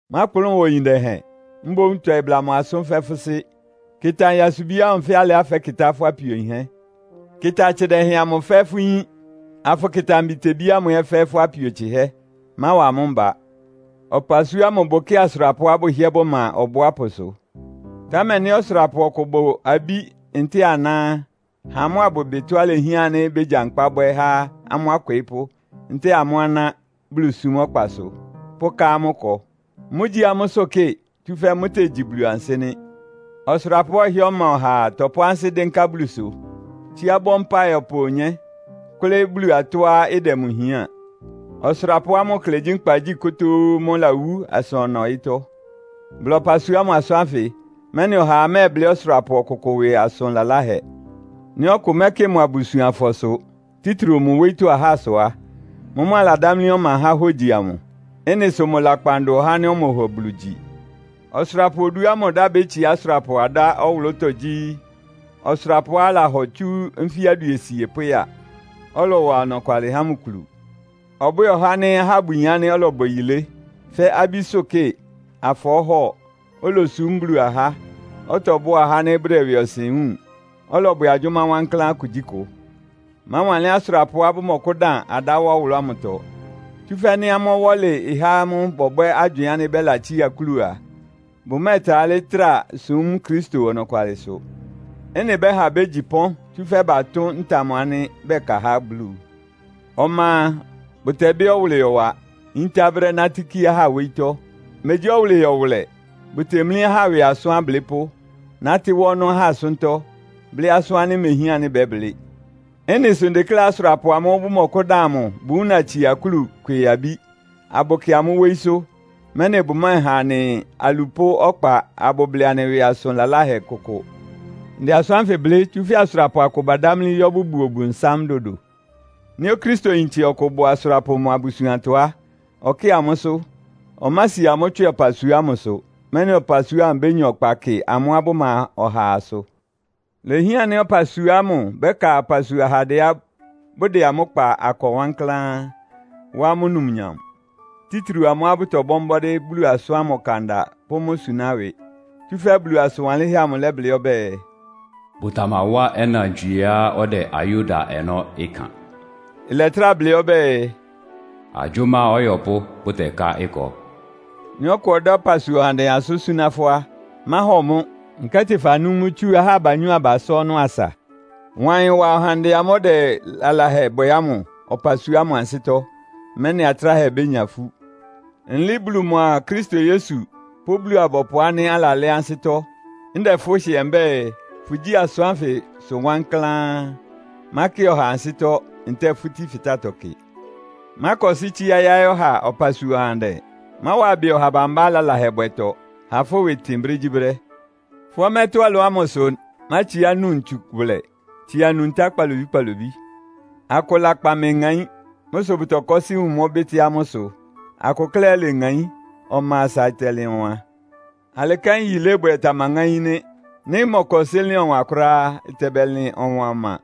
Mákplʋn wa oyin dɛhɛn. Mboún tɔɩ bla mʋ asʋ́n fɛ́ fʋ́ sɩ́. Kɩta nyasubi ámʋ fɛ́ alɩá fɛ́kɩtá fʋ́ apio yinhɛ́. Kɩta atsɩ dɛhɛn amʋ fɛ́ fʋ́ yín, afʋkɩta mbitebí ámʋ ɛ́ fɛ́ fʋ́ apio tsɩhɛ́. Máwa amʋ́ mba. Ɔpasua ámʋ bʋkɩ́ɩ asʋrapʋá bʋhɩ́ɛ́ bʋma ɔbʋápʋsʋ. Támɛ nɩ́ ɔsʋrapʋ ɔkʋ bʋ abí ntɛ́ɛ aná á, ha amʋ́ abʋbɩ tɔ́á ilehián ánɩ́ bégyankpá bwɛ́ há amʋ́ akwɩɩ́pʋ́ ntɛ́ɛ amʋ́ aná Bulusúm ɔkpasʋ, pʋka amʋ́ akɔ. Mʋ́gyí amʋ́sʋ́ kɩ, tsúfɛ́ mʋ́tegyi Bulu ansɩ́ nɩ́. Ɔsʋrapʋá ɔhɩ́ɛ́ ɔma ɔhaa tɔpʋ́ ansɩ́ dɩ́nká Bulusʋ, tsíá bɔ mpáɩ ɔpa onyé, kʋ́lɩ́ Bulu tɔ́á ɩdɛ mʋ hián. Ɔsʋrapʋá mʋ klɛ gyí nkpagyí kotóó mʋ́ lawú asa ɔna ɔyɩ́tɔ́. Bla ɔpasua ámʋ asʋ́n ánfɩ, mɛ́nɩ ɔhaa mɛ́ɛblɩ́ ɔsʋrapʋ ɔkʋkʋ ɩwɩ asʋn laláhɛ. Nɩ́ ɔkʋ mɛ́kɩ mʋ abusuanfɔsʋ, títriu mʋ wóyítɔ́ ahásʋ á, mʋ́mʋ́ aladámlí ɔma há hógyi amʋ. Ɩ́nɩ sʋ mʋ lakpan dʋn ɔhá ánɩ́ ɔmɔhɔ Bulu gyi. Ɔsʋrapʋ oduá mʋ ɩdá bétsiá asʋrapʋ adá ɔwʋlʋ́tɔ́ gyí, ɔsʋrapʋá alahɔ tsú nfí aduesie pʋ́ya, ɔlɔwa ɔnɔkwalɩ há mʋ kulu. Ɔbwɛ́ɛ ɔhá ánɩ́ ahá bʋyin ánɩ́ ɔlɔbwɛ yilé, fɛ́ abísʋ́kɩ, afɔɔ́hɔ, olosúm Bulu ahá, ɔtɔbʋ́a ahá ánɩ́ bʋdɛ ɩwɩɔsɩn wúun, ɔlɔbwɛ agyʋ́má wankláán kugyíkʋ. Máwanlɩ́n asʋrapʋá bʋmɔkʋ́dan adá wá ɔwʋlʋ́ ámʋtɔ, tsúfɛ́ nɩ́ amʋ́ ɔwɔ́lɩ ɩhá amʋ́ bɔbwɛ́ agywɩɩn ánɩ́ bɛ́latsía akúlu a, bʋmɛ́ɛtrá talɩ́ súm Kristo ɔnɔkwalɩsʋ. Ɩ́nɩ ɩbɛ́ha bégyi pɔ́n, tsúfɛ́ batʋ́n amʋ́ ntam ánɩ́ bɛka há Bulu. Ɔma a, bʋtɛbɩ́ ɔwʋlɩyɔ wa, yíntá brɛ́ nátɩ́ kí ahá wóyítɔ́. Megyí ɔwʋlɩyɔ wʋlɛ, bʋtemlí ahá ɩwɩ asʋ́n ablɩ́pʋ́, nátɩ́ wá ɔnɔ́ ahá asʋ́ntɔ́, blɩ́ asʋ́n ánɩ́ imehián ánɩ́ bɛ́blɩ́. Ɩ́nɩ sʋ ndekléá asʋrapʋ amʋ́ʋ́ bʋmɔkʋ́dan amʋ bʋwúna tsia akúlu kwɩɩ abí, abʋkɩ amʋ́ wóyísʋ́, mɛ́nɩ bʋmɛ́ɛha anɩ alupʋ́ ɔkpa abʋblɩ anɩ ɩwɩ asʋn laláhɛ kʋkʋ. Ndɛ asʋ́n ánfɩ blɩ́, tsúfɛ́ asʋrapʋ akʋ badámlí yɔ́ bʋbuo Ɔbʋnsám dodo. Nɩ́ Okristoyintse ɔkʋ bʋ asʋrapʋ mʋ abusuantɔ á, ɔkɩ́ɩ amʋ́sʋ́. Ɔmási amʋ́ tswɩ ɔpasua ámʋsʋ, mɛ́nɩ ɔpasua ámʋ bénya ɔkpa kɩ amʋ́á bʋma ɔhaasʋ. Ilehián ánɩ́ ɔpasua ámʋ bɛ́ka ɔpasua ahandɛá bʋdɛ amʋ́ kpa akɔ wankláán, wá amʋ́ numnyam. Títriu amʋ́á bʋtɔbɔ́ mbɔ́dɩ́ Bulu asʋ́n ámʋ ɔkanda pʋ́ mʋ́ suná ɩwɩ. Tsúfɛ́ Bulu asʋn wanlɩ́nhɛ́ amʋ ɩlɛblɩ́ ɔbɛ́ɛ, “Bʋtamawá ɔnantswieá ɔdɛ ayó da ɔnɔ́ ɩkan.” Ɩlɛtrá blɩ́ ɔbɛ́ɛ, “Agyʋ́má ɔyɔpʋ́ bʋtɛká ɩkɔ.” Nɩ́ ɔkʋ ɔdá ɔpasua ɔhandɛ asʋ́n súná fʋ́ á, máhɔ mʋ́, nkɛ́tɩ fanú mʋ́ tsú ahá abanyɔ́-abasá ɔnɔ́ asa. Wa ɩyɩn wa ɔhandɛ ámʋ́ʋ́ ɔdɛ lalahɛ bwɛ ámʋ ɔpasua ámʋ ansɩ́tɔ́, mɛ́nɩ atráhɛ bénya ifú. Nlɩɩ́ Bulu mʋa Kristo Yesu pʋ́ Bulu-abɔpʋ ánɩ́ alalɛ́ ansɩ́tɔ́, ndɛ fʋ́ hɩɛ mbɛ́ɛ, fʋgyí asʋ́n ánfɩsʋ wankláán. Mákɩ ɔhaa ansɩ́tɔ́ ntɛ́ɛ fútí fɩtátɔ kɩ. Mákɔsɩ́ tsíá yáɩ́ ɔha ɔpasua ɔhandɛ. Máwa ɩbɩ ɔha bambá lalahɛbwɛtɔ. Ha fʋ́ ɩwɩ ɩtɩn brégyíbrɛ́. Fʋ́ ɔmɛ́tɔ́ ɩlɔ ámʋ sʋ mátsiá nu ntsu wʋlɛ, tsia nu ntá kpalobí-kpalobí. Akʋ lakpan meŋaín. Mʋ́ sʋ bʋtɔkɔ́sɩ́ wun mʋ́ bɩ́tɩ́ amʋ́ ɩsʋ. Akʋ klɛ́ ɛ́ leŋaín, ɔma asa ɩtɛlɩn ɔwan. Alɩ kɛ́n yilébwɛ tamaŋáín nɩ́. Nɩ́ ɩmɔkɔsɩ́ lɩn ɔwan kʋ́ráá á, ɩtɛbɛlɩn ɔwan ɔma.